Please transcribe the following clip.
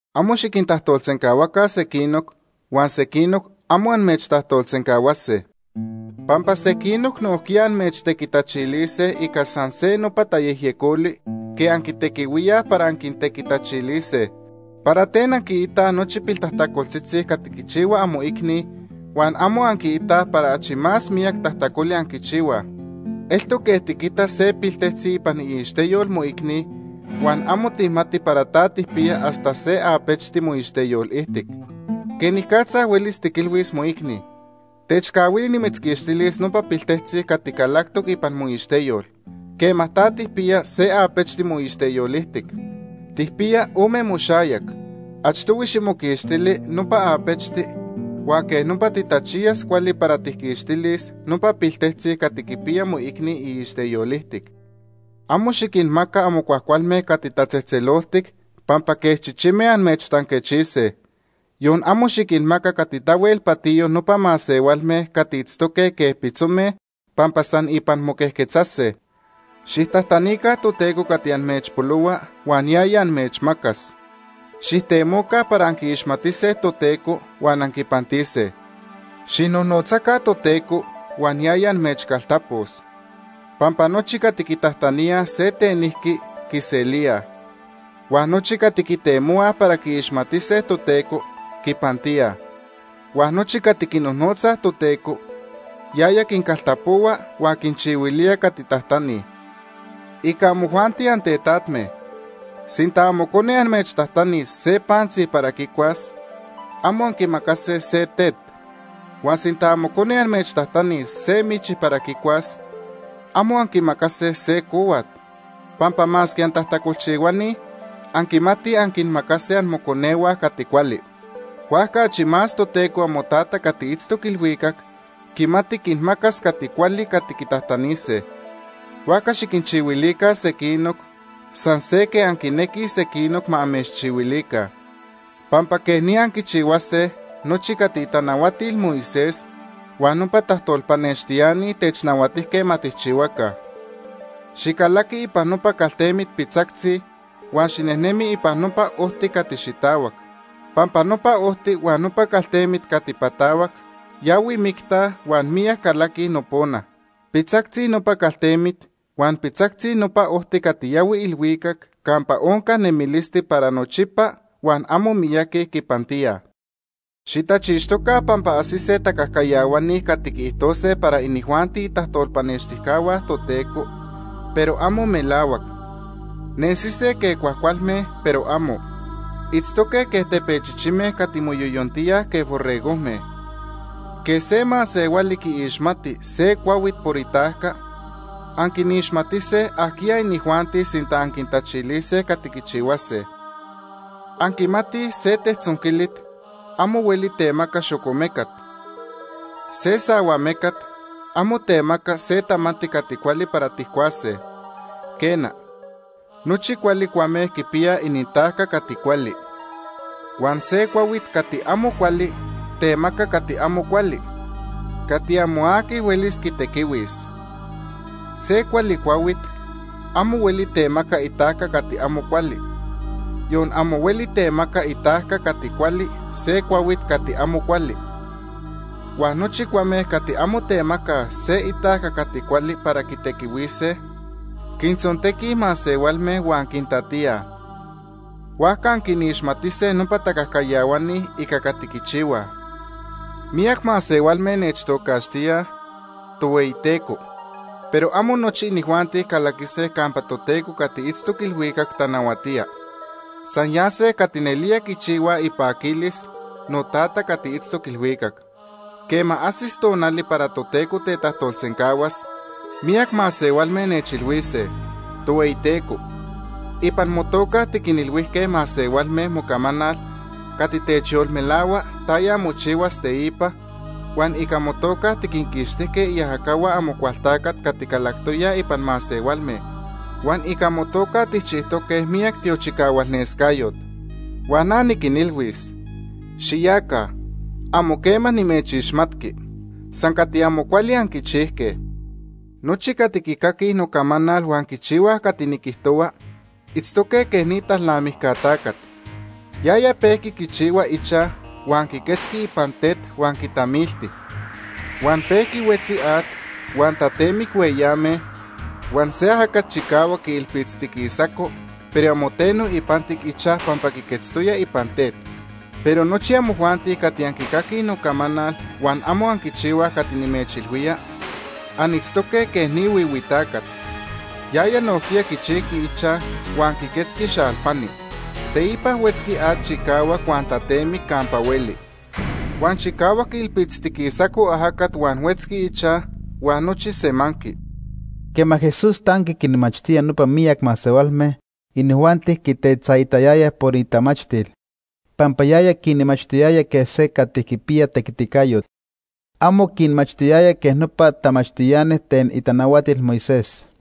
“Amo xiquintajtolsencahuaca sequinoc, huan sequinoc amo amechtajtolsencahuase. Pampa sequinoc nojquiya amechtequitachilise ica san se nopa tayejyecoli quej anquitequihuíaj para anquintequitachilise. ¿Para ten anquiitaj nochi piltajtacoltzitzi cati quichihua amoicni huan amo anquiitaj para achi más miyac tajtacoli anquichihuaj? Eltoc quej tiquita se piltejtzi ipan iixteyol moicni, huan amo tijmati para ta tijpiya hasta se apechti moixteyol ijtic. ¿Quenicatza huelis tiquilhuis moicni: ‘Techcahuili nimitzquixtilis nopa piltejtzi cati calactoc ipan moixteyol’, quema ta tijpiya se apechti moixteyol ijtic? Tijpiyaj ome moxayac. Achtohui ximoquixtili nopa apechti, huan quej nopa titachiyas cuali para tijquixtilis nopa piltejtzi cati quipiya moicni iixteyol ijtic. “Amo xiquinmaca amo cuajcualme cati tatzejtzeloltic pampa quej chichime amechtanquechise. Yon amo xiquinmaca cati tahuel patiyo nopa masehualme cati itztoque quej pitzome, pampa san ipan moquejquetzase. “Xijtajtanica Toteco cati amechpolohua huan yaya amechmacas. Xijtemoca para anquiixmatise Toteco huan anquipantise. Xijnojnotzaca Toteco huan yaya amechcaltapos. Pampa nochi cati quitajtaníaj se tenijqui, quiselíaj. Huan nochi cati quitemohuaj para quiixmatise Toteco, quipantíaj. Huan nochi cati quinojnotzaj Toteco, yaya quincaltapohua huan quinchihuilía cati tajtanij. “Ica amojuanti antetatme, sinta amocone amechtajtanis se pantzi para quicuas, amo anquimacase se tet. Huan sinta amocone amechtajtanis se michi para quicuas, amo anquimacase se cohuat, pampa masque antajtacolchihuani anquimatij anquinmacase amoconehua cati cuali. Huajca achi más Toteco amoTata cati itztoc ilhuicac quimati quinmacas cati cuali cati quitajtanise. “Huajca xiquinchihuilica sequinoc, san se quej anquinequij sequinoc ma amechchihuilica. Pampa quej ni anquichihuase nochi cati itanahuatil Moisés huan nopa tajtolpanextiani technahuatijque ma tijchihuaca. “Xicalaqui ipan nopa caltemit pitzactzi huan xinejnemi ipan nopa ojti cati xitahuac, pampa nopa ojti huan nopa caltemit cati patahuac yahui micta huan miyac calaquij nopona. Pitzactzi nopa caltemit huan pitzactzi nopa ojti cati yahui ilhuicac campa onca nemilisti para nochipa huan amo miyaqui quipantíaj. “Xitachixtoca pampa ajsise tacajcayahuani cati quiijtose para inijuanti itajtolpanextijcahua Toteco, pero amo melahuac. Nesise quej cuajcualme, pero amo. Itztoque quej tepechichime cati moyoyontíaj quej borregojme. Quej se masehuali quiixmati se cuahuit por itajca, anquinixmatise ajquiya inijuanti sinta anquitachilise cati quichihuase. Anquimatij se tejtzonquilit amo hueli temaca xocomecat. Se sahuamecat amo temaca se tamanti cati cuali para tijcuase. Quena, nochi cuali cuame quipiyaj inintajca cati cuali. Huan se cuahuit cati amo cuali temaca cati amo cuali, cati amo aqui huelis quitequihuis. Se cuali cuahuit amo hueli temaca itajca cati amo cuali, yon amo hueli temaca itajca cati cuali se cuahuit cati amo cuali. Huan nochi cuame cati amo temacaj se itajca cati cuali para quitequihuise, quintzontequij masehualme huan quintatíaj. Huajca anquinixmatise nopa tacajcayahuani ica cati quichihuaj. “Miyac masehualme nechtocaxtíaj: ‘Tohueyiteco’, pero amo nochi inijuanti calaquise campa Toteco cati itztoc ilhuicac tanahuatía. San yase cati nelía quichihuaj ipaquilis noTata cati itztoc ilhuicac. Quema ajsis tonali para Toteco tetajtolsencahuas, miyac masehualme nechilhuise: ‘Tohueyiteco, ipan motoca tiquinilhuijque masehualme mocamanal cati techyolmelahua taya mochihuas teipa, huan ica motoca tiquinquixtijque iajacahua Amocualtacat cati calactoyaj ipan masehualme, huan ica motoca tijchijtoque miyac tiochicahualnescayot’ Huan na niquinilhuis: ‘Xiyaca. Amo quema nimechixmatqui. San cati amo cuali anquichijque.’ “Nochi cati quicaquij nocamanal huan quichihuaj cati niquijtohua itztoque quej ni talnamijca tacat. Yaya pejqui quichihua ichaj huan quiquetzqui ipan tet huan quitamilti. Huan pejqui huetzi at, huan tatemic hueyame, huan se ajacat chicahuac quiilpitztiquisaco, pero amo teno ipantic ichaj pampa quiquetztoya ipan tet. Pero nochi amojuanti cati anquicaquij nocamanal huan amo anquichihuaj cati nimechilhuía, anitztoque quej ni huihui tacat. Yaya nojquiya quichijqui ichaj, huan quiquetzqui xalpani. Teipa huetzqui at chicahuac huan tatemic campa hueli. Huan chicahuac quiilpitztiquisaco ajacat huan huetzqui ichaj, huan nochi semanqui.” Quema Jesús tanqui quinmachtía nopa miyac masehualme, inijuanti quitetzaitayayaj por itamachtil, pampa yaya quinmachtiyaya quej se cati quipiya tequiticayot. Amo quinmachtiyaya quej nopa tamachtiani ten itanahuatil Moisés.